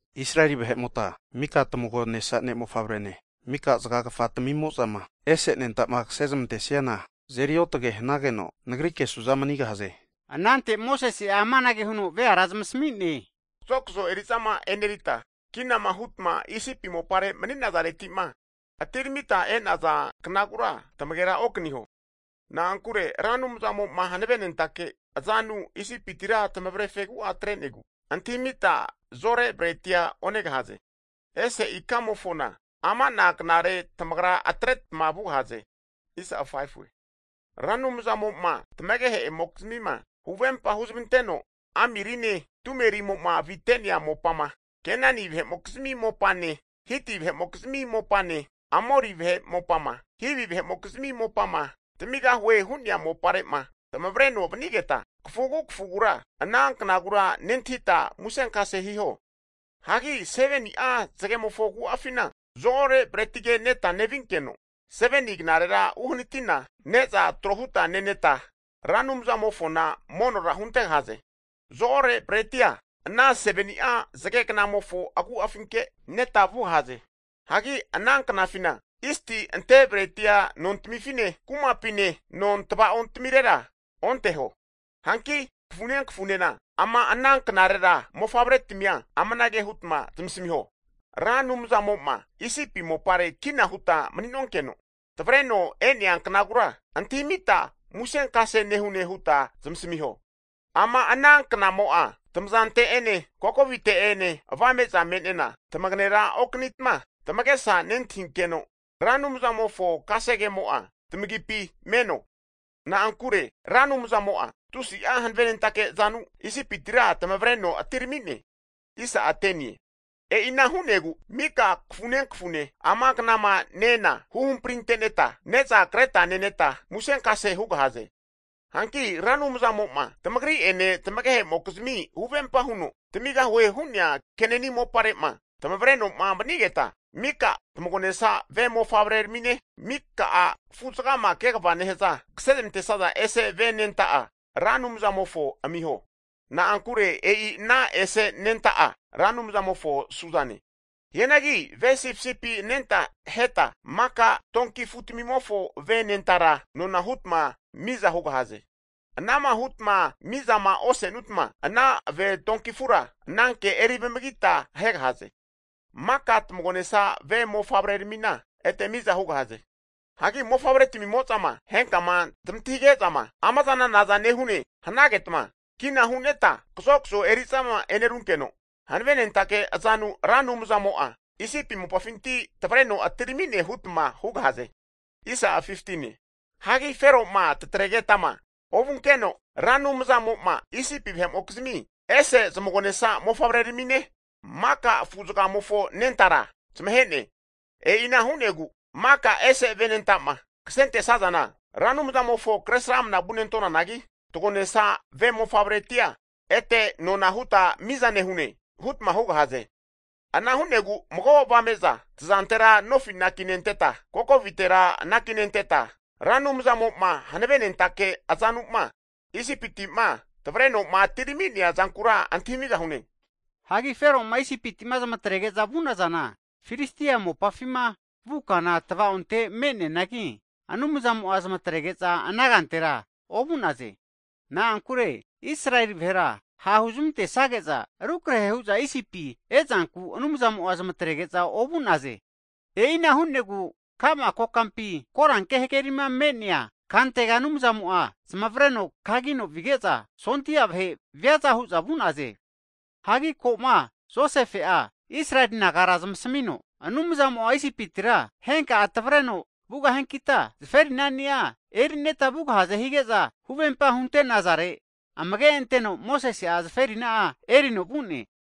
Israeli vahe'mota mika tmagonesa ne' mofavrene, mika zagagafa timimo'zama ese anenta'ma kase zmantesiana, azeri otage hanageno, Nagrike su'za manigahaze. Anante Mosese'a amanage huno veara zamasmi'ne, kazokzo eri'zama e'nerita kinama hutma Isipi mopare mani'nazareti'ma atiramita e'naza knagura tmagera okaniho. Na'ankure Ra Anumzamo'ma hanavenentake azanu Isipitira tamavre fegu'a atre'negu, antahimita zore bretia onegahaze. Ese ikamofona (Abibie) amana knare tamagra atretma vugahaze. Ra Anumzamo'ma tmagehe'mokizmima huvempa huzmanteno, amirine, tumerimo'ma avite'nea mopama Kenani vahe'mokizmi mopane, Hiti vahe'mokizmi mopane, Amori vahe'mopama, Hivi vahe'mokizmi mopama tamigahuema hu'nea mopare'ma tamavreno vanigeta, kafugu kafugura ana knagura nentahita musenkase hiho. Hagi 7ni'a zagemofo agu'afina zo-ore bretige neta nevinkeno, 7ni knarera uhanatina ne'za trohuta neneta, Ra Anumzamofona monora huntegahaze. Zo-ore bretia ana 7ni'a zage knamofo agu'afinke neta vugahaze. Hagi ana knafina, zisti ante bretia nontimifine, kumapine non tva'ontamirera onteho. Hanki kafune kafunena ama ana knarera mofavretimia amanage hutma zmasmiho, Ra Anumzamo'ma Isipi mopare kina huta mani'nonkeno tavreno e'nea knagura antahimita musenkase nehune huta zmasmiho. Ama ana knamo'a tamazante'ene kokovite'ena avame'za me'nena, tamagera okanitma tamagesa nentahinkeno, Ra Anumzamofo kasegemo'a tamagipi meno. Na'ankure Ra Anumzamo'a tusi'a hanavenentake azanu Isipitira tamavreno atirami'ne. E'ina hu'negu mika kafune kafune ama knama ne-ena, huhampriteneta ne'za kreta neneta musenkase hugahaze. Hanki Ra Anumzmo'ma tamagri'ene tmagehemokizmi huvempa huno, zamigahue hu'nea Kenani mopare'ma tavreno'ma vanigeta, mika tmagonesa ve mofavreramine, mika'a afu'zagama kegava nehaza afu'mo'zama kasezmantesaza ese' ve anenta'a, Ra Anumzamofo amiho. Na'ankure e'i ana ese anenta'a Ra Anumzamofo su'zane. Hianagi ve sipisipi anenta aheta maka donki afutamimofo ve anentara nona hutma miza hugahaze. Ana'ma hutma mizama osenutma, ana ve donki afura ananke eri vamagita ahegahaze. Maka tmagonesa ve mofavreramina ete miza hugahaze. Hagi mofavretamimo'zama henkama tamantahige'zama amazana nazane hanagetma, kina hu'neta kazokzo eri'zama e'nerunkeno, hanavenentake azanu Ra Anumzamo'a Isipi mopafinti tavreno atirami'ne hutma hugahaze. Hagi Fero'ma tatregetama ovunkeno, Ra Anumzamo'ma Isipi vahe'mokizmi ese zmagonesa mofavreramine, maka afu'zagamofo anentara zamahe'ne. E'ina hu'negu maka ese ve anenta'ma kasentesazana Ra Anumzamofo kresramna vunentonanagi, tagonesa ve mofavretia ete nona huta miza nehune hutma hugahaze. Ana hu'negu mago avame'za tazantera nofi anakinenteta kokovitera anakinenteta, Ra Anumzamo'ma hanavenentake azanu'ma Isipiti'ma tavreno'ma atirami'nea zankura antahimigahune. Hagi Fero'ma Isipiti'ma zmatrege'za vu'nazana, Filistia mopafima vu kana tavaonte me'neanagi, Anumzamo'a zmatrege'za ana kantera ovu'naze. Na'ankure Israeli vahera ha' huzmantesage'za rukrehe hu'za Isipi e'zanku Anumzamo'a zmatrege'za ovu'naze. E'ina hu'negu ka'ma kokampi koranke hagerima me'nea kantega Anumzamo'a zamavreno kagino vige'za sondia vahe viaza hu'za vu'naze. Hagi ko'ma Josefe'a Israeli nagara zamsamino, Anumzamo'a Isipitira henka tamavreno vugahiankita zaferinani'a eri'neta vugahaze hige'za huvemapa hunte'nazare, amage anteno Mosese'a zaferina'a erino vu'ne.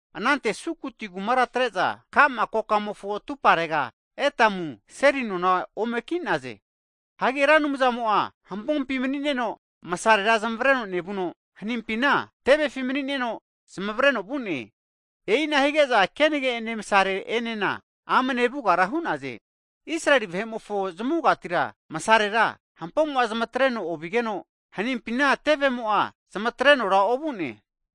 Anante Sukoti kumara atre'za ka'ma kokamofo atumparega, Etamu seli nona ome ki'naze. Hagi Ra Anumzamo'a hampompi manineno msarera zamavreno nevuno, hanimpina tevefi mani'neno zamavreno vu'ne. E'ina hige'za kenage'ene masare'enena amne vugara hu'naze. Israeli vahe'mofo zmavugatira masarera hampomo'a zamatreno ovigeno, hanimpina tevemo'a zamatrenora ovu'ne.